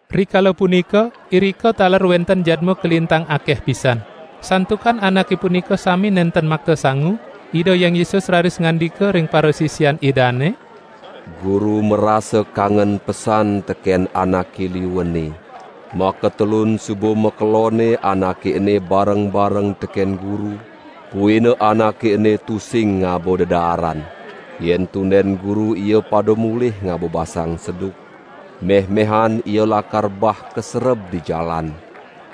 Rikala punika, irika taler wenten jadma kalintang akeh pisan. Santukan anake punika sami nenten makta sangu, Ida Hyang Yesus raris ngandika ring parasisian Idane: "Guru marasa kangen pesan teken anake liu ene. Makatelun suba makelonne anake ene bareng-bareng teken Guru, buina anake ene tusing ngaba dedaaran. Yen tunden Guru ia pada mulih ngaba basang seduk, mehmehan ia lakar bah kasereb di jalan,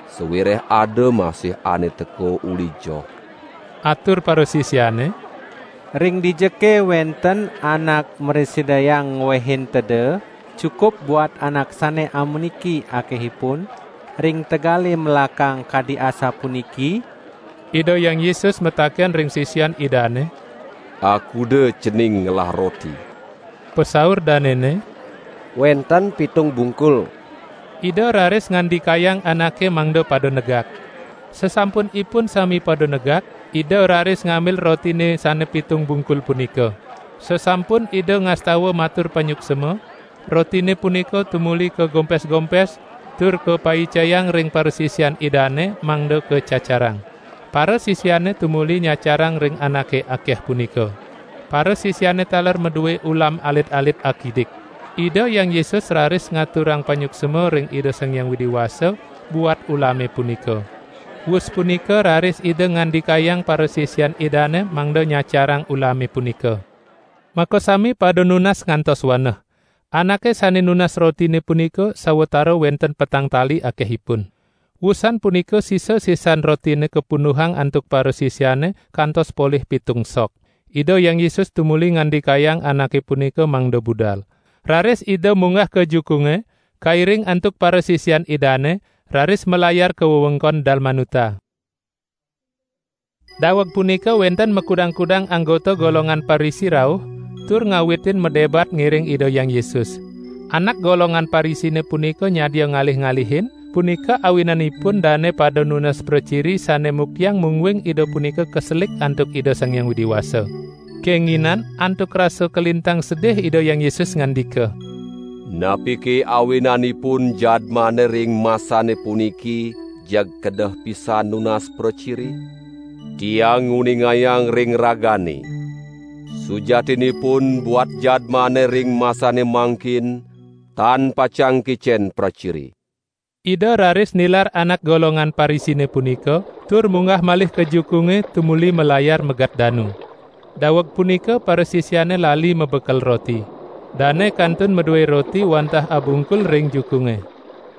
sawireh ada masih ane teka uli joh." Atur parasisiane: "Ring dijake wenten anak mrasidayang ngwehin teda cukup buat anak sane amuniki akehipun ring tegale melakang kadi asapuniki?" Ida Hyang Yesus mataken ring sisian Idane: "Akuda cening ngelah roti?" Pasaur danene: "Wenten pitung bungkul." Ida raris ngandikayang anake mangda pada negak. Sasampunipun sami pada negak, Ida raris ngambil rotine sane pitung bungkul punika. Sasampun Ida ngastawa matur panyuksma, rotine punika tumuli kagompes-gompes tur kapaicayang ring parasisian Idane mangda kacacarang. Parasisiane tumuli nyacarang ring anake akeh punika. Parasisiane taler madue ulam alit-alit akidik. Ida Hyang Yesus raris ngaturang panyuksma ring Ida Sang Hyang Widi Wasa buat ulame punika. Wus punika raris Ida ngandikayang parasisian Idane mangda nyacarang ulame punika. Makasami pada nunas kantos waneh. Anake sane nunas rotine punika sawatara wenten petang tali akehipun. Wusan punika sisa-sisan rotine kapunduhang antuk parasisiane kantos polih pitung sok. Ida Hyang Yesus tumuli ngandikayang anake punika mangda budal. Raris Ida munggah ka jukunge, kairing antuk parasisian Idane, raris malayar ka wewengkon Dalmanuta. Daweg punika wenten makudang-kudang anggota golongan Parisi rauh, tur ngawitin madebat ngiring Ida Hyang Yesus. Anak golongan Parisine punika nyadia ngalih-alihin, punika awinanipun dane pada nunas praciri sane muktiang mungguing Ida punika kaselik antuk Ida Sang Hyang Widi Wasa. Kenginan antuk rasa kalintang sedih Ida Hyang Yesus ngandika: "Napike awinanipun jadmane ring masane puniki jeg kedeh pisan nunas praciri? Tiang nguningayang ring ragane, sujatinipun buat jadmane ring masane mangkin tan pacang kicen praciri." Ida raris nilar anak golongan Parisine punika, tur munggah malih ka jukunge, tumuli malayar megat danu. Daweg punika parasisiane lali mabekel roti. Dane kantun madue roti wantah abungkul ring jukunge.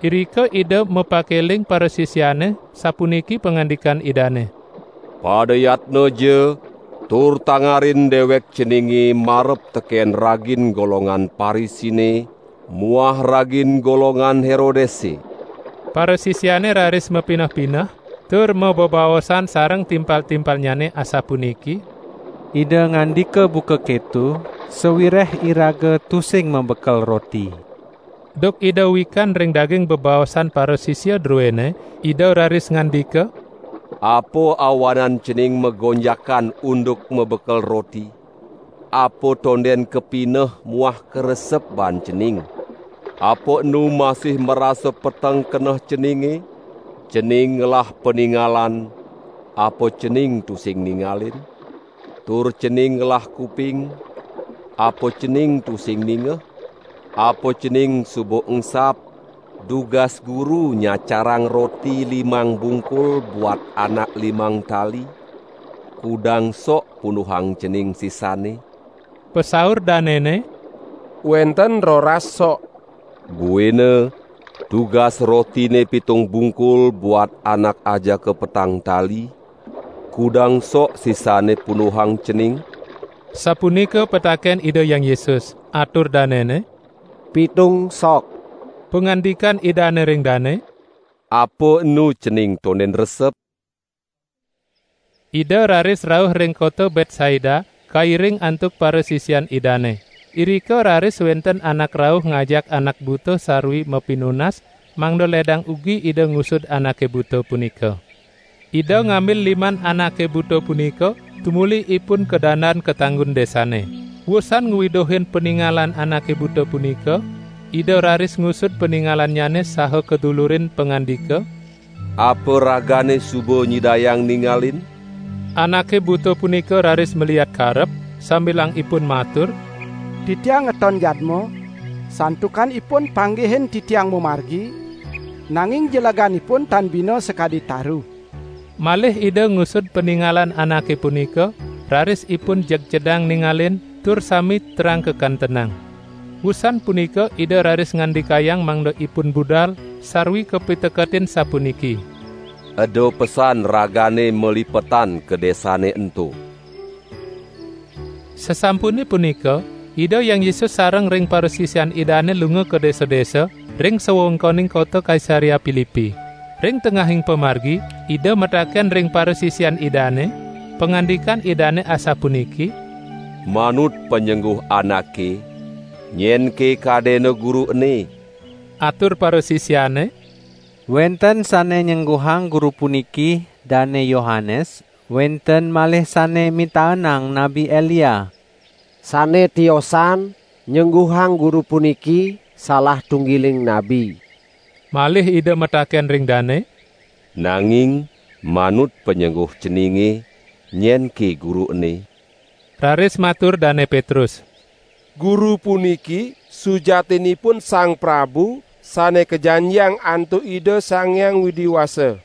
Irika Ida mapakeling parasisiane sapuniki pangandikan Idane: "Pada yatnaja tur tangarin dewek ceninge marep teken ragin golongan Parisine muah ragin golongan Herodese." Parasisiane raris mapineh-pineh tur mabebaosan sareng timpal-timpalnyane asapuniki: "Ida ngandika buka keto sawireh iraga tusing mabekel roti." Duk Ida wikan ring daging bebaosan parasisia druene, Ida raris ngandika: "Apa awanan cening magonjakan unduk mabekel roti? Apa tonden kapineh muah karesep baan cening? Apa enu masih marasa peteng keneh ceninge? Cening ngelah paningalan, apa cening tusing ningalin? Tur cening ngelah kuping, apa cening tusing ningeh? Apa cening suba engsap, dugas Guru nyacarang roti limang bungkul buat anak limang tali? Kudang sok punduhang cening sisanne?" Pasaur danene: "Wenten roras sok." "Buina dugas rotine pitung bungkul buat anak ajaka petang tali, kudang sok sisanne punduhang cening?" sapunika pataken Ida Hyang Yesus. Atur danene: "Pitung sok." Pangandikan Idane ring dane: "Apa enu cening tonden resep?" Ida raris rauh ring kota Betsaida kairing antuk parasisian Idane. Irika raris wenten anak rauh ngajak anak buta sarwi mapinunas mangda ledang ugi Ida ngusud anake buta punika. Ida ngambil liman anake buta punika tumuli ipun kadandan ka tanggun desane. Wusan ngwiduhin paningalan anake buta punika, Ida raris ngusud paningalannyane saha kadulurin pangandika: "Apa ragane suba nyidayang ningalin?" Anake buta punika raris maliat karep, sambilang ipun matur: "Titiang ngeton jadma, santukan ipun panggihin titiang mamargi, nanging jeleganipun tan bina sakadi taru." Malih Ida ngusud paningalan anake punika, raris ipun jeg cedang ningalin, tur sami terang kakantenang. Wusan punika Ida raris ngandikayang mangda ipun budal, sarwi kapiteketin sapuniki: "Eda pesan ragane malipetan ka desane ento!" Sasampune punika Ida Hyang Yesus sareng ring parasisian Idane lunga ka desa-desa ring sawewengkoning kota Kaisarea Pilipi. Ring tengahing pamargi, Ida mataken ring parasisian Idane, pangandikan Idane asapuniki: "Manut panyengguh anake, nyenke kadena Guru ene?" Atur parasisiane: "Wenten sane nyengguhang Guru puniki Dane Yohanes, wenten malih sane mitaenang Nabi Elia, sane tiosan nyengguhang Guru puniki salah tunggiling nabi." Malih Ida mataken ring dane: "Nanging manut panyengguh ceninge, nyenke Guru ene?" Raris matur Dane Petrus: "Guru puniki sujatinipun Sang Prabu Sane Kajanjiang antuk Ida Sang Hyang Widi Wasa!"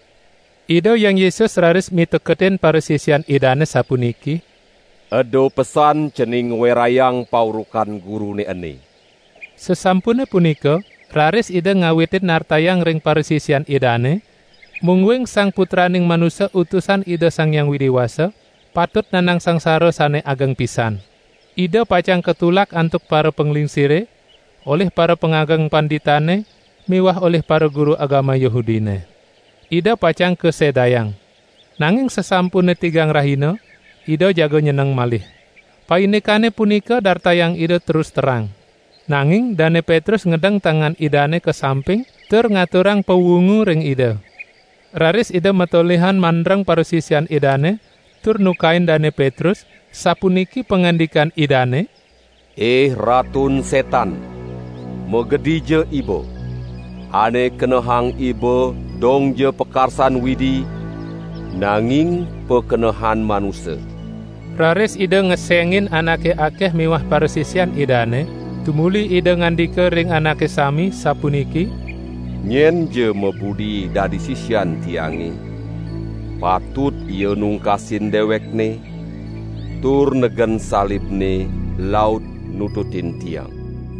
Ida Hyang Yesus raris miteketin parasisian Idane sapuniki: "Eda pesan cening ngwerayang paurukan Gurune ene!" Sasampune punika, raris Ida ngawitin nartayang ring parasisian Idane, mungguing Sang Putraning Manusa Utusan Ida Sang Hyang Widi Wasa patut nandang sangsara sane ageng pisan. Ida pacang katulak antuk parapanglingsire, olih parapangageng panditane miwah olih paraguru agama Yahudine! Ida pacang kasedayang. Nanging sasampune tigang rahina, Ida jaga nyeneng malih. Paindikane punika dartayang Ida terus terang. Nanging Dane Petrus ngedeng tangan Idane ka samping tur ngaturang pawungu ring Ida. Raris Ida matolihan mandreng parasisian Idane tur nukain Dane Petrus, sapuniki pangandikan Idane: "Ih Ratun Setan, magedija iba! Ane kenehang iba dongja pakarsan Widi, nanging pakenehan manusa!" Raris Ida ngesengin anake akeh miwah parasisian Idane, tumuli Ida ngandika ring anake sami, sapuniki: "Nyenja mabudi dadi sisian Tiange, patut ia nungkasin dewekne, tur negen salibne laut nututin Tiang.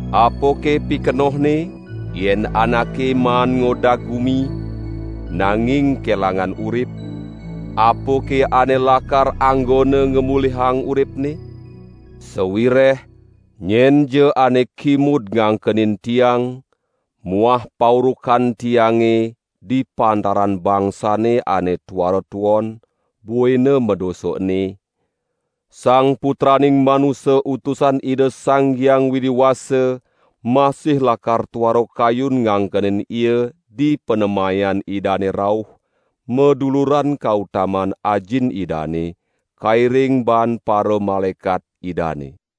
Apake pikenohne yen anake maan ngodag gumi, nanging kelangan urip? Apake ane lakar anggona ngamulihang uripne? Sawireh nyenja ane kimud ngangkenin Tiang muah paurukan Tiange di pantaran bangsane ane tuara tuon buina madosa ene, Sang Putraning Manusa Utusan Ida Sang Hyang Widi Wasa masih lakar tuara kayun ngangkenin ia dipanemayan Idane rauh maduluran kautaman Ajin Idane kairing baan paramalaekat Idane."